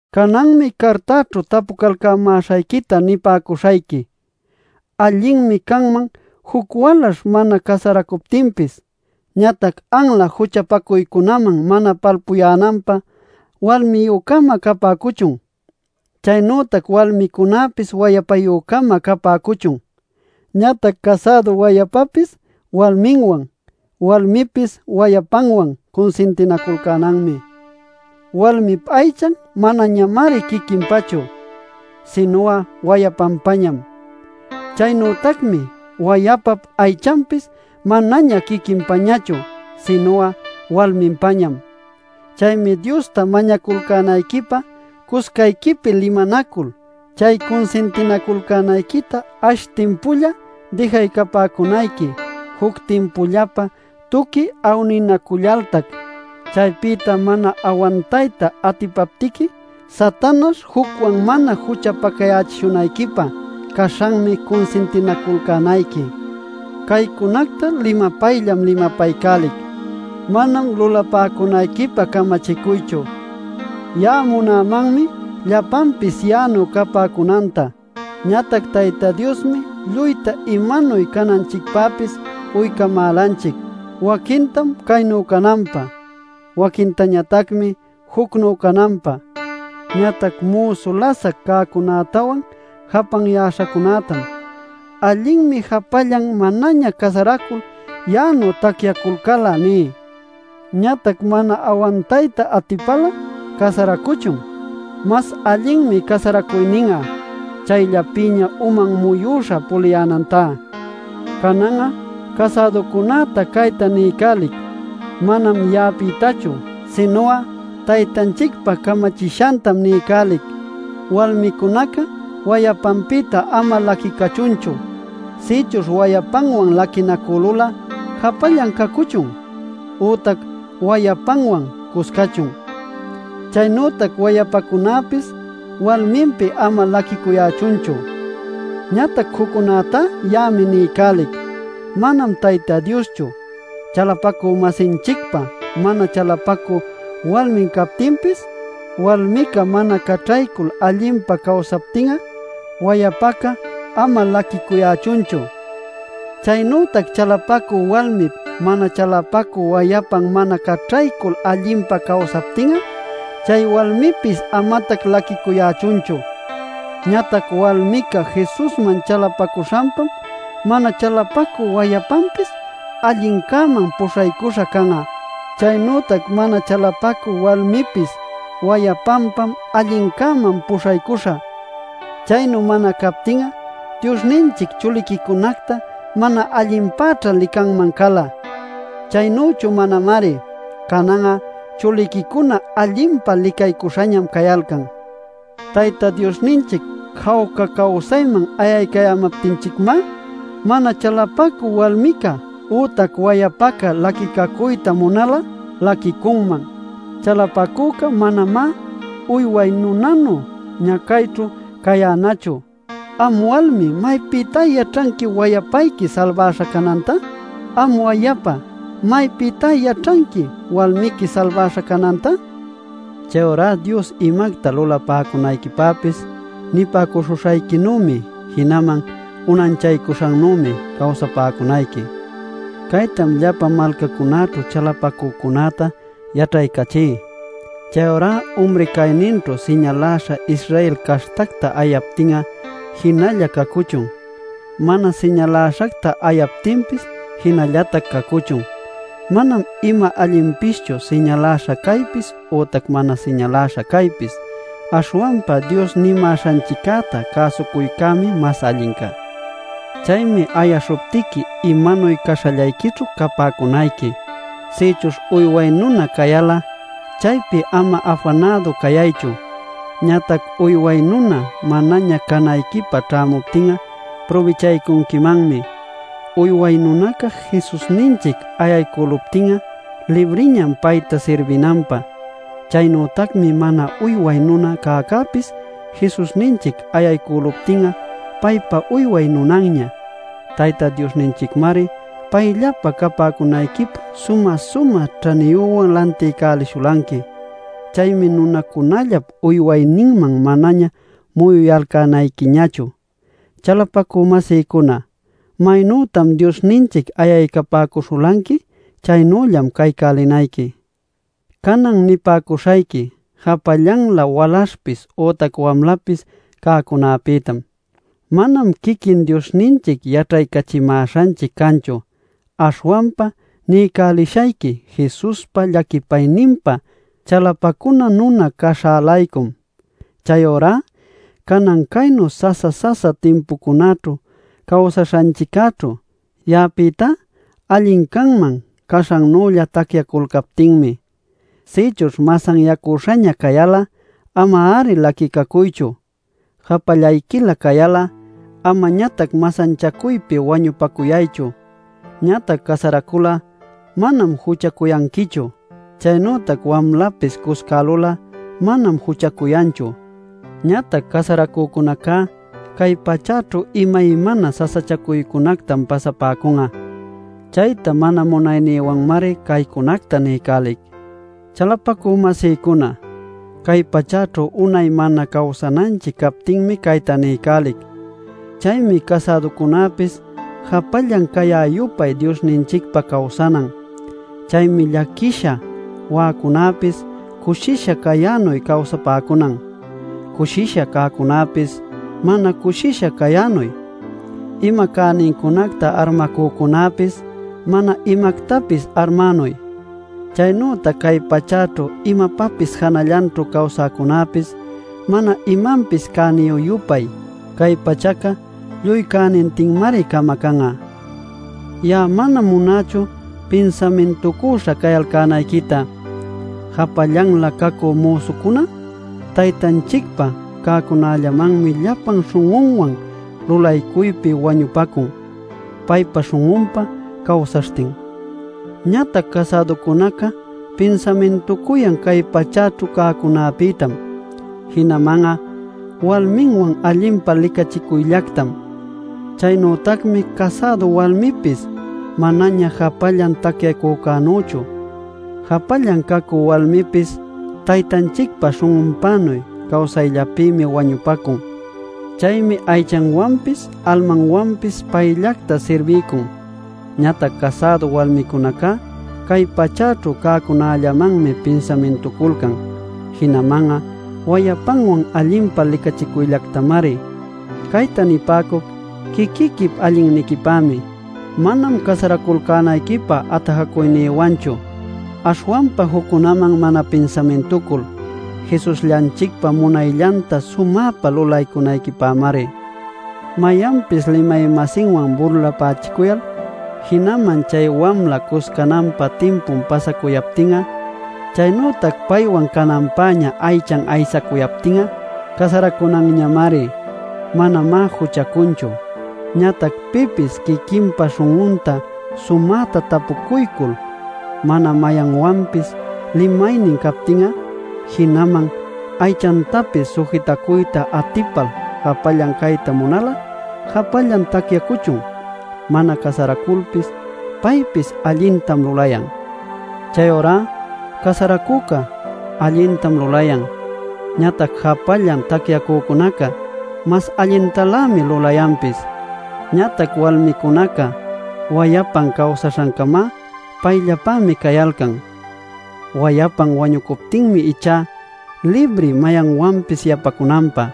Cananmi cartaćhu tapucalcämäśhayquita nipäcuśhayqui. Allinmi canman juc walaśh mana casaracuptinpis. Ñatac anla juchapacuycunaman mana palpuyänanpä walmiyü-cama capäcuchun, chaynütac walmicunäpis wayapayü-cama capäcuchun. Ñatac casädu wayapapis walminwan, walmipis wayapanwan cunsintinaculcänanmi. Walmip aychan manañamari quiquinpachu, sinu'a wayapanpañam. Chaynütacmi wayapap aychanpis manaña quiquinpañachu sinu'a walminpañam. Chaymi Diosta mañaculcänayquipä cuscayquipi limanacul chay cunsintinaculcänayquita ash timpulla dijaycapäcunayqui juc timpullapä tuqui awninacullaltac. Chaypïta mana awantayta atipaptiqui Satanaśh jucwan mana juchapacayächishunayquipä caśhanmi cunsintinaculcänayqui. Caycunacta limapayllam limapaycälic, manam lulapäcunayquipä camachicuychu. Ya'a munämanmi llapanpis ya'anuy capäcunanta. Ñatac Tayta Diosmi lluyta imanuy cananchicpäpis uycamälanchic: waquintam caynu cananpä, waquintañatacmi jucnu cananpä. Ñatac müsu lasac cäcunätawan japanyäśhacunätam “Allinmi japallan manaña casaracul ya'anuy tacyaculcal'a” ní. Ñatac mana awantayta atipal'a casaracuchun. Mas allinmi casaracuynin'a chayllapïña uman muyüśha puliyänantá. Canan'a casäducunäta cayta niycälic — manam ya'apïtachu, sinu'a Taytanchicpa camachishantam niycälic: Walmicunaca wayapanpïta ama laquicuchunchu. Sïchuśh wayapanwan laquinacülul'a japallan cacuchun, ütac wayapanwan cuscachun. Chaynütac wayapacunäpis walminpi ama laquicuyächunchu. Ñatac juccunätá ya'ami niycälic, manam Tayta Dioschu: chalapacü-masinchicpa mana chalapacü walmin captinpis, walmica mana caćhaycul allinpa cawsaptin'a, wayapaca ama laquicuyächunchu. Chaynütac chalapacü walmip mana chalapacü wayapan mana caćhaycul allinpa cawsaptin'a, chay walmipis amatac laquicuyächunchu. Ñatac walmica Jesusman chalapacuśhanpam mana chalapacü wayapanpis allincäman puśhaycuśha can'a. Chaynütac mana chalapacü walmipis wayapanpam allincäman puśhaycuśha. Chaynu mana captin'a Diosninchic chuliquicunacta mana allinpäćha licanman cala. Chaynüchu manamari; canan'a chuliquicuna allinpa licaycuśhañam cayalcan. Tayta Diosninchic jawca cawsayman ayaycayämaptinchicmá mana chalapacü walmica ütac wayapaca laquicacuyta munal'a, laquicunman. Chalapacüca manamá uyway nunanu ñacayćhu cayänachu. ¿Am walmi maypïtá yaćhanqui wayapayqui salbaśha cananta? ¿Am wayapa maypïtá yaćhanqui walmiqui salbaśha cananta? Chayurá Dios imacta lulapäcunayquipäpis nipäcuśhuśhayquinümi, jinaman unanchaycuśhannümi cawsapäcunayqui. Caytam llapa malcacunäćhu chalapacücunäta yaćhaycachí. Chayurá umri cayninćhu siñaläśha Israel caśhtacta ayaptin'a jinalla cacuchun. Mana siñaläśhacta ayaptinpis jinallatac cacuchun. Manam ima allinpischu siñaläśha caypis ütac mana siñaläśha caypis. Aśhwanpa Dios nimäśhanchiccäta cäsucuycämi mas allinca. Chaymi ayaśhuptiqui imanuy caśhallayquićhu capäcunayqui. Sïchuśh uyway nuna cayal'a, chaypi ama afanädu cayaychu. Ñatac uyway nuna manaña canayquipä ćhämuptin'a prubichaycunquimanmi. Uyway nunaca Jesusninchic ayaycüluptin'a libriñam payta sirbinanpä. Chaynütacmi mana uyway nuna cäcäpis Jesusninchic ayaycüluptin'a paypa uyway nunanña. Tayta Diosninchicmari payllapä capäcunayquipä sumä-sumä ćhaniyüwan lantiycälishulanqui. Chaymi nunacunallap uywayninman manaña muyuyalcänayquiñachu. Chalapacü-masïcuna, maynütam Diosninchic ayaycapäcuśhulanqui, chaynüllam caycälinayqui. Canan nipäcuśhayqui japallanlä walaśhpis ütac wamlapis cäcunapïtam. Manam quiquin Diosninchic yaćhaycachimäśhanchic canchu, aśhwanpa niycälishayqui Jesuspa llaquipayninpa chalapacuna nuna caśhä-laycum. Chayurá canan caynu sasa-sasa timpucunaćhu cawsaśhanchiccäćhu, ya'apïtá allin canman caśhannülla tacyaculcaptinmi. Sïchuśh masanyacüśhaña cayal'a ama-ari laquicacuychu. Japallayquilä cayal'a amañatac masanchacuypi wañupacuyaychu. Ñatac casaracul'a manam juchacuyanquichu. Chaynütac wamlapis cuscälul'a manam juchacuyanchu. Ñatac casaracücunaca cay pachäćhu imaymana sasachacuycunactam pasapäcun'a. Chayta mana munaynïwanmari caycunacta niycälic. Chalapacü-masïcuna, cay pachäćhu unay mana cawsananchic captinmi cayta niycälic. Chaymi casäducunäpis japallan cayä-yupay Diosninchicpä cawsanan. Chaymi llaquisha wa'acunäpis cushisha cayänuy cawsapäcunan. Cushisha cäcunapis mana cushisha cayänuy. Ima cänincunacta armacücunäpis mana imactapis armänuy. Chaynütac cay pachäćhu imapapis janallanćhu cawsäcunäpis mana imanpis cäniyü-yupay. Cay pachaca lluy cänintinmari camacan'a. Ya'a manam munächu pinsamintucüśha cayalcänayquita. Japallanlä cacü müsucuná Taytanchicpa cäcunallamanmi llapan śhun'unwan lulaycuypi wañupacun, paypa śhun'unpä cawsaśhtin. Ñatac casäducunaca pinsamintucuyan cay pachäćhu cäcunapïtam, jinaman'a walminwan allinpa licachicuyllactam. Chaynütacmi casädu walmipis manaña japallan tacyacücänüchu. Japallan cacü walmipis Taytanchicpa śhun'unpänuy cawsayllapïmi wañupacun. Chaymi aychanwanpis almanwanpis payllacta sirbiycun. Ñatac casädu walmicunacá cay pachäćhu cäcunällamanmi pinsamintuculcan jinaman'a wayapanwan allinpa licachicuyllactamari. Cayta nipäcuc quiquiquip allinniquipämi, manam casaraculcänayquipä atajacuynïwanchu. Aśhwanpa juccunaman mana pinsamintucul Jesusllanchicpa munayllanta sumäpa lulaycunayquipämari. Mayanpis limay-masinwan burlapächicuyal, jinaman chay wamla cuscananpä timpun pasacuyaptin'a, chaynütac paywan cananpäña aychan aysacuyaptin'a, casaracunanñamari. Manamá juchacunchu. Ñatac pipis quiquinpa śhun'unta sumäta tapucuycul, mana mayanwanpis limaynin captin'a, jinaman aychantapis sujitacuyta atipal japallan cayta munal'a, japallan tacyacuchun. Mana casaraculpis paypis allintam lulayan. Chayurá casaracücá allintam lulayan. Ñatac japallan tacyacücunacá mas allintalämi lulayanpis. Ñatac walmicunaca wayapan cawsaśhancama payllapämi cayalcan. Wayapan wañucuptinmi ichá libri mayanwanpis yapacunanpä.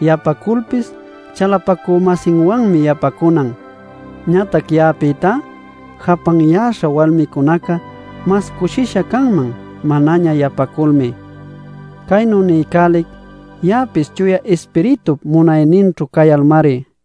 Yapaculpis chalapacü-masinwanmi yapacunan. Ñatac ya'apïtá japanyäśha walmicunaca mas cushisha canman manaña yapaculmi. Caynu niycälic ya'apis Chuya Ispiritup munayninćhu cayalmari.